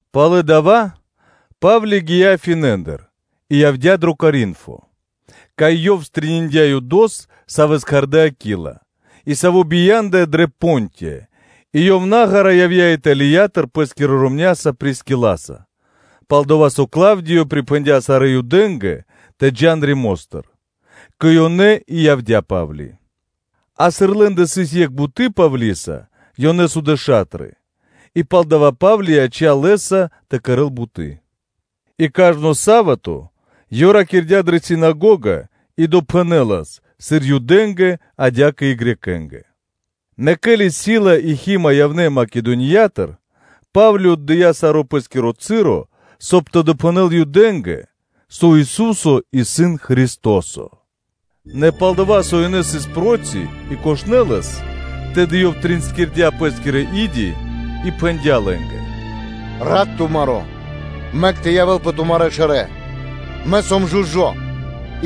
Пало́ дава́ Па́вли гия́ Афинэндыр, и явдя́ дро Коринфо; кай ёв стрэниндя (пирилыя) Юдос, савэ́с кхардэ́ Акила, и саво́ бия́ндыя дрэ Понтия, и ёв наґара явдя́ Италиятыр пэ́скирэ ромня́са Прискиласа (пал-дова́ со Клавдио припхэндя́ сарэ́ Юдэ́нгэ тэ джа́н Римостыр); кэ ёнэ и явдя́ Па́вли, а сыр лэ́ндэ сыс екх буты́ Павлиса, ёнэ судэ ша́тры, и палдава́ Па́вли яця́пэ лэ́са тэ кэрэ́л буты́. И кажно са́вато (субо́та) ёв ракирдя́ дрэ синагога и допхэнэлас, сыр Юдэ́нгэ, адя́кэ и Грекэ́нгэ (Баламэ́нгэ). Нэ ке́ли Сила и Хима явнэ́ Македониятыр, Па́вли отдыя́ саро́ пэ́скиро часо, соб (кай) тэ допхэнэл Юдэ́нгэ, со Ису́со исын Христо́со. Нэ пал-дова́ со ёнэ сыс проти и кошнэ лэс, тэды ёв тринскирдя пэ́скирэ и́ди и пхэндя́ лэ́нгэ: “Рат тумаро́ мэк тэ явэ́л пэ тумарэ́ шэрэ́: мэ сом жужо́;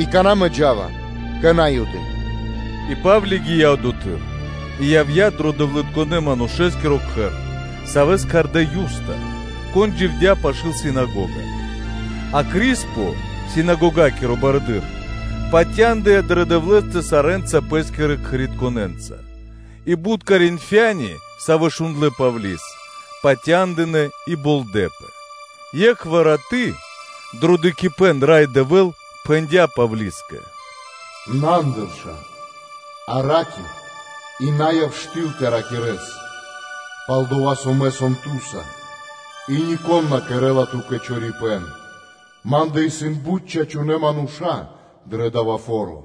и какана́ мэ джа́ва кэ На́юды.” И Па́вли гия́ одотхы́р и явдя́ дро дэвлытконэ́ – манушэ́скиро кхэр, савэ́с кхардэ́ Юста, кон дживдя́ пашы́л синагога. А Криспо, синагогакиро барыдыро́, патяндыя дрэ Дэвлэ́стэ сарэ́нца пэ́скирэ кхэритконэнца; и бут Коринфяни, савэ́ шундлэ́ Павли́с, патяндынэ́ и болдэпэ. е́кхвар раты́ дрэ дыкхибэ́н Рай Дэвэ́л пхэндя́ Павлискэ: “На андырша, а ра́кир, и на яв штыл тэ ракирэ́с, палдова́ со Мэ сом ту́са, и нико́н на кэрэ́ла ту́кэ чорипэ́н; Ма́ндэ исын бут чачунэ́ мануша́ дрэ дава́ фо́ро.”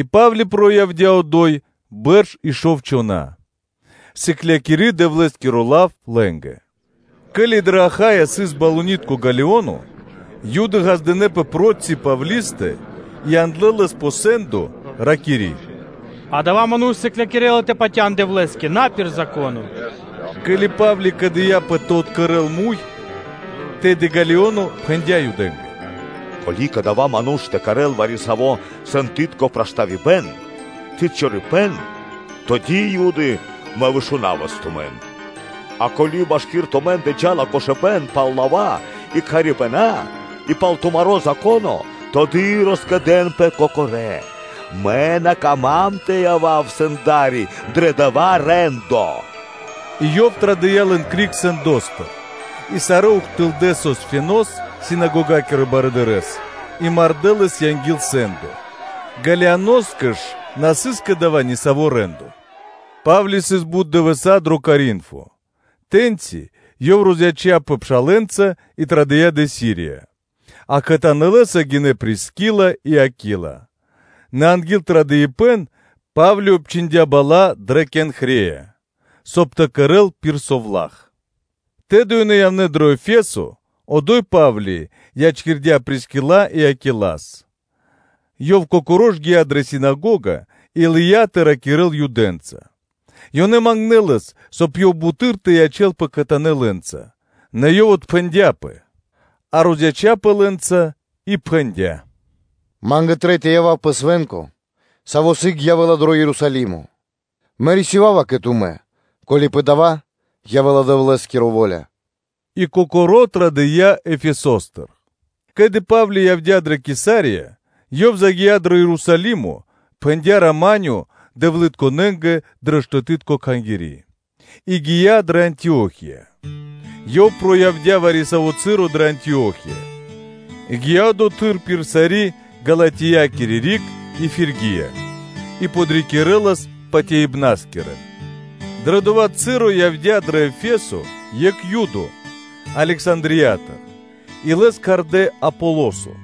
И Па́вли сыс одо́й бэрш и шов чхона́, сыклякири Дэвлэ́скиро лав лэ́нгэ. Ке́ли дрэ Ахая сыс балунитко (проконсуло) Галионо, Юды ґаздынэ́пэ проти Павлистэ и яндлэ́ лэс пэ сэ́ндо, ракири́: “Адава́ ману́ш сыклякирэ́ла тэ патя́н Дэвлэ́скэ на пир Зако́но.” Ке́ли Па́вли кэдыяпэ тэ откэрэл муй, тэды Галионо пхэндя́ Юдэ́нгэ: “Ко́ли кадава́ ману́ш тэ кэрэ́л вари-саво́ сэндытко проштавибэн (преступлениё) ци чорипэ́н, тэды, Юды, мэ вышунавас тумэн; а, ко́ли машки́р тумэ́ндэ джа́ла кошыбэ́н пал лава́ и кхарибэна и пал тумаро́ Зако́но, тэды роскэдэнпэ кокорэ́, мэ на кама́м тэ явав сэнда́ри дро дава́ рэ́ндо.” И ёв традыя́ лэн криг сэндостыр. И сарэ́ ухтылдэ́ Сосфенос, синагогакирэс барыдырэ́с, и мардэ́ лэс анги́л сэ́ндо. Галионоскэ ж на сыс кэ дава́ нисаво́ рэ́ндо. Па́вли сыс бут дывэса́ дро Коринфо, тэ́ньчи ёв розяцяпэ пшалэ́нца и традыя́ кэ Сирия, а кхэтанэ́ лэ́са гинэ́ Прискила и Акила, нэ анги́л традыпэн Па́вли обчхиндя бала́ дрэ Кенхрея, соб (кай) тэ кэрэ́л пир совла́х; тэды ёнэ явнэ́ дрэ Ефесо, одо́й Па́вли ячкирдя́ Прискила и Акилас. Ёв кокоро́ ж гия́ дрэ синагога и лыя́ тэ ракирэ́л Юдэнца. Ёнэ мангнэ́ лэс, соб (кай) ёв буты́р тэ ячэ́лпэ кхэтанэ́ лэ́нца, нэ ёв отпхэндяпэ, а розяцяпэ лэ́нца и пхэндя́: “Ма́нгэ трэй тэ явав пэ свэ́нко, саво́ сыг явэ́ла, дро Ерусалимо; мэ рисёва́ва кэ тумэ́, ко́ли пэ дава́ явэ́ла Дэвлэ́скиро во́ля, и кокоро́ традыя́ Ефесостыр.” Ке́ли Па́вли явдя́ дрэ Кесария, ёв загия́ дро Ерусалимо, пхэндя́ “рама́нё” дэвлытконэнгэ дрэ штэты́тко кхангири́, и гия́ дрэ Антио́хия. Ёв сыс вари-саво́ часо дрэ Антио́хия, и гия́ одотхы́р пир сари́ Галатиякири риг и Фиргия, и подрикирэлас патяибнаскирэн. Дрэ дова́ часо явдя́ дро Ефесо екх Юдо, Александриятыр и лэс кхардэ́ Аполосо,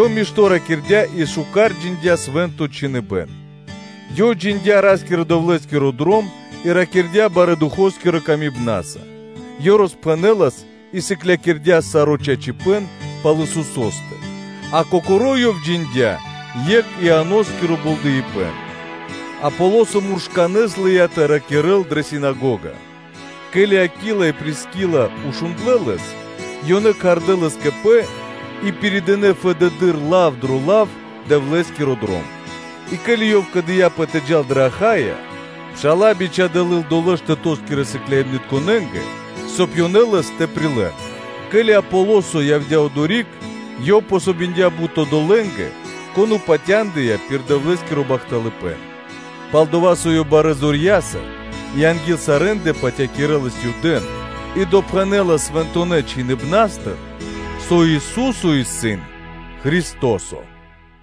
ёв мишто́ ракирдя́ и мишто́ джиндя́ Свэ́нто Чхиныбэ́н. Ёв джиндя́ Ра́скирэ-Дэвлэ́скиро Дром и ракирдя́ барэ́ Духо́скирэ патыва́са, ёв роспхэнэлас и сыклякирдя́ саро́ чачипэ́н пал Исусо́стэ, а кокоро́ ёв джиндя́ екх Ианоскиро болдэипэн. Аполосо муршканэ́с лыя́ тэ ракирэ́л дрэ синагога. Ке́ли Акила и Прискила шундлэ́ лэс, ёнэ кхардэ́ лэс кэ пэ, и пиридынэ фэдэды́р лав дро лав Дэвлэ́скиро Дром. И ке́ли ёв кэдыяпэ тэ джал дрэ Ахайя, пша́ла бичхадэ́ лыл долэ́ штэтоскирэ сыкляибнытнытконэнгэ, соб (кай) ёнэ лэс тэ прилэ́н; ке́ли Аполосо явдя́ одори́к, ёв помогиндя (дыя васт) бут одолэ́нгэ, кон патяндыя пир Дэвлэ́скиро бахталыпэ́н. Пал-дова́ со ёв барэ́ зорья́са и анги́л сарэ́ндэ патякирэлас Юдэ́н и допхэнэлас Свэнтонэ́ Чхиныбна́стыр, со Ису́со исын Христо́со (Месия).